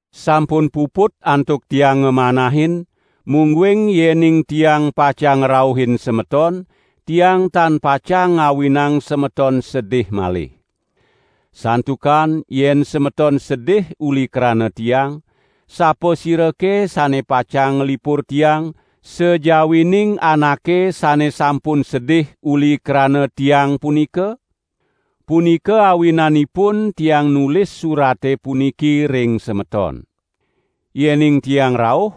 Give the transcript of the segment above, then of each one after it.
Sampun puput antuk tiang ngamanahin, mungguing yening tiang pacang ngrauhin semeton, tiang tan pacang ngawinang semeton sedih malih. Santukan yen semeton sedih uli krana tiang, sapasirake sane pacang nglipur tiang, sajawining anake sane sampun sedih uli krana tiang punika? Punika awinanipun tiang nulis surate puniki ring semeton. Yening tiang rauh,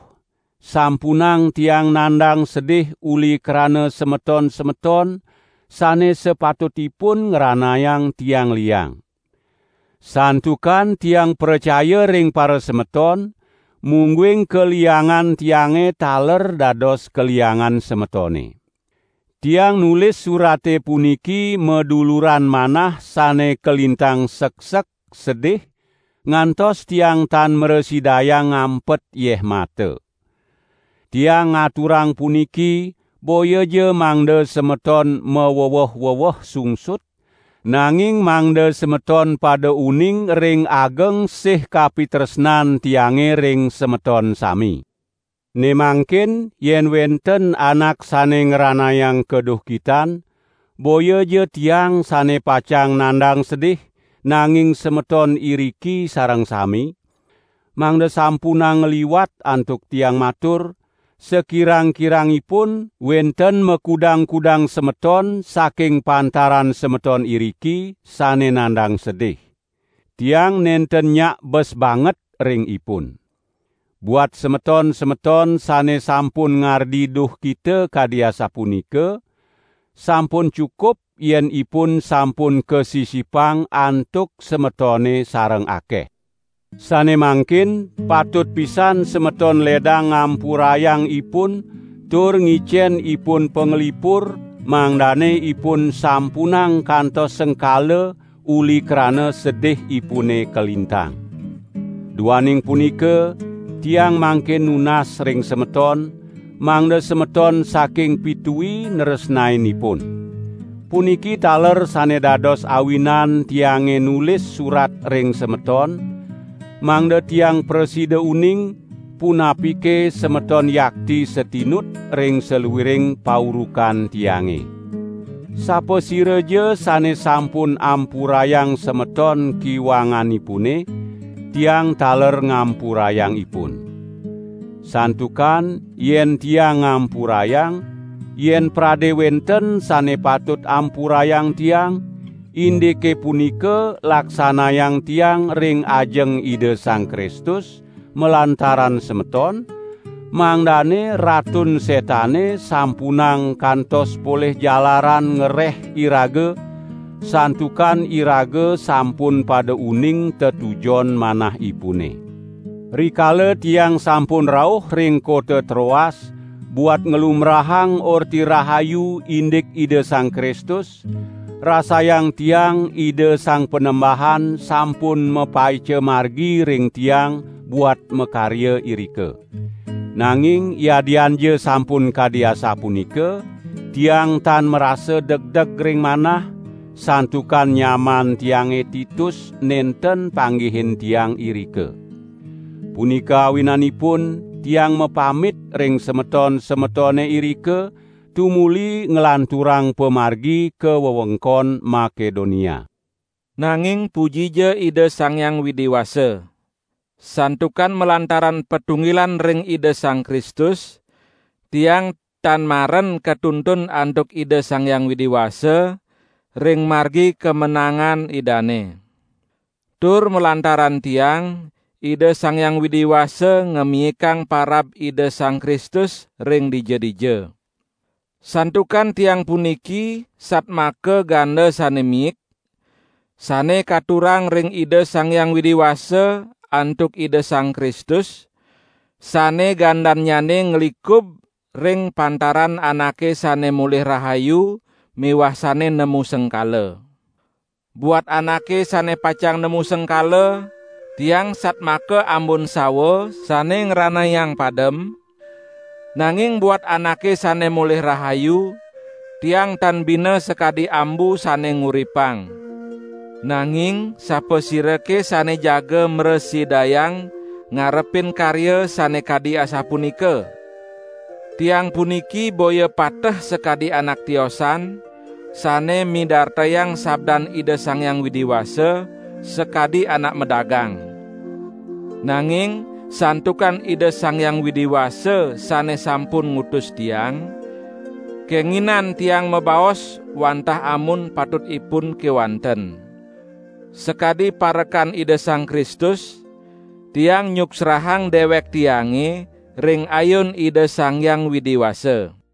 sampunang tiang nandang sedih uli krana semeton-semeton sane sapatutipun ngranayang tiang liang. Santukan tiang pracaya ring parasemeton, mungguing kaliangan tiange taler dados kaliangan semetone. Tiang nulis surate puniki maduluran manah sane kalintang seksek, sedih, ngantos tiang tan mrasidayang ngampet yeh mata. Tiang ngaturang puniki boyaja mangda semeton maweweh-weweh sungsut, nanging mangda semeton pada uning ring ageng sih kapitresnan tiange ring semeton sami. Ne mangkin yen wenten anak sane ngranayang kaduhkitan, boyaja tiang sane pacang nandang sedih, nanging semeton iriki sareng sami; mangda sampunang ngliwat antuk tiang matur, sakirang-kirangipun wenten makudang-kudang semeton saking pantaran semeton iriki sane nandang sedih. Tiang nenten nyak bes banget ring ipun. Buat semeton-semeton sane sampun ngardi duhkita kadi asapunika, sampun cukup yen ipun sampun kasisipang antuk semetone sareng akeh. Sane mangkin patut pisan semeton ledang ngampurayang ipun tur ngicen ipun panglipur mangdane ipun sampunang kantos sengkala uli krana sedihipune kalintang. Duaning punika tiang mangkin nunas ring semeton, mangda semeton saking pitui nresnain ipun. Puniki taler sane dados awinan tiange nulis surat ring semeton, mangda tiang prasida uning, punapike semeton yakti satinut ring saluiring paurukan tiange. Sapasiraja sane sampun ampurayang semeton kiwanganipune, tiang taler ngampurayang ipun. Santukan yen tiang ngampurayang, yen prade wenten sane patut ampurayang tiang, indike punika laksanayang tiang ring ajeng Ida Sang Kristus, malantaran semeton, mangdane Ratun Setane sampunang kantos polih jalaran ngereh iraga, santukan iraga sampun pada uning tetujon manahipune. Rikala tiang sampun rauh ring kota Troas buat nglumbrahang Orti Rahayu indik Ida Sang Kristus, rasayang tiang Ida Sang Panembahan sampun mapaica margi ring tiang buat makarya irika! Nanging yadianja sampun kadi asapunika, tiang tan marasa degdeg ring manah, santukan nyaman tiange Titus nenten panggihin tiang irika. Punika awinanipun tiang mapamit ring semeton-semetone irika tumuli nglanturang pamargi ka wewengkon Makedonia. Nanging pujija Ida Sang Hyang Widi Wasa. Santukan malantaran patunggilan ring Ida Sang Kristus, tiang tan maren katuntun antuk Ida Sang Hyang Widi Wasa ring margi kamenangan Idane. Tur malantaran tiang, Ida Sang Hyang Widi Wasa ngamiikang parab Ida Sang Kristus ring dija-dija. Santukan tiang puniki satmaka ganda sane miik, sane katurang ring Ida Sang Hyang Widi Wasa antuk Ida Sang Kristus, sane gandannyane nglikub ring pantaran anake sane molih rahayu miwah sane nemu sengkala. Buat anake sane pacang nemu sengkala, tiang satmaka ambun sawa sane ngranayang padem, nanging buat anake sane molih rahayu, tiang tan bina sakadi ambu sane nguripang. Nanging sapasirake sane jaga mrasidayang ngarepin karya sane kadi asapunika? Tiang puniki boya pateh sakadi anak tiosan sane midartayang sabdan Ida Sang Hyang Widi Wasa sakadi anak madagang. Nanging santukan Ida Sang Hyang Widi Wasa sane sampun ngutus tiang, kenginan tiang mabaos wantah amun patutipun kewanten. Sakadi parekan Ida Sang Kristus, tiang nyuksrahang dewek tiange ring ayun Ida Sang Hyang Widi Wasa.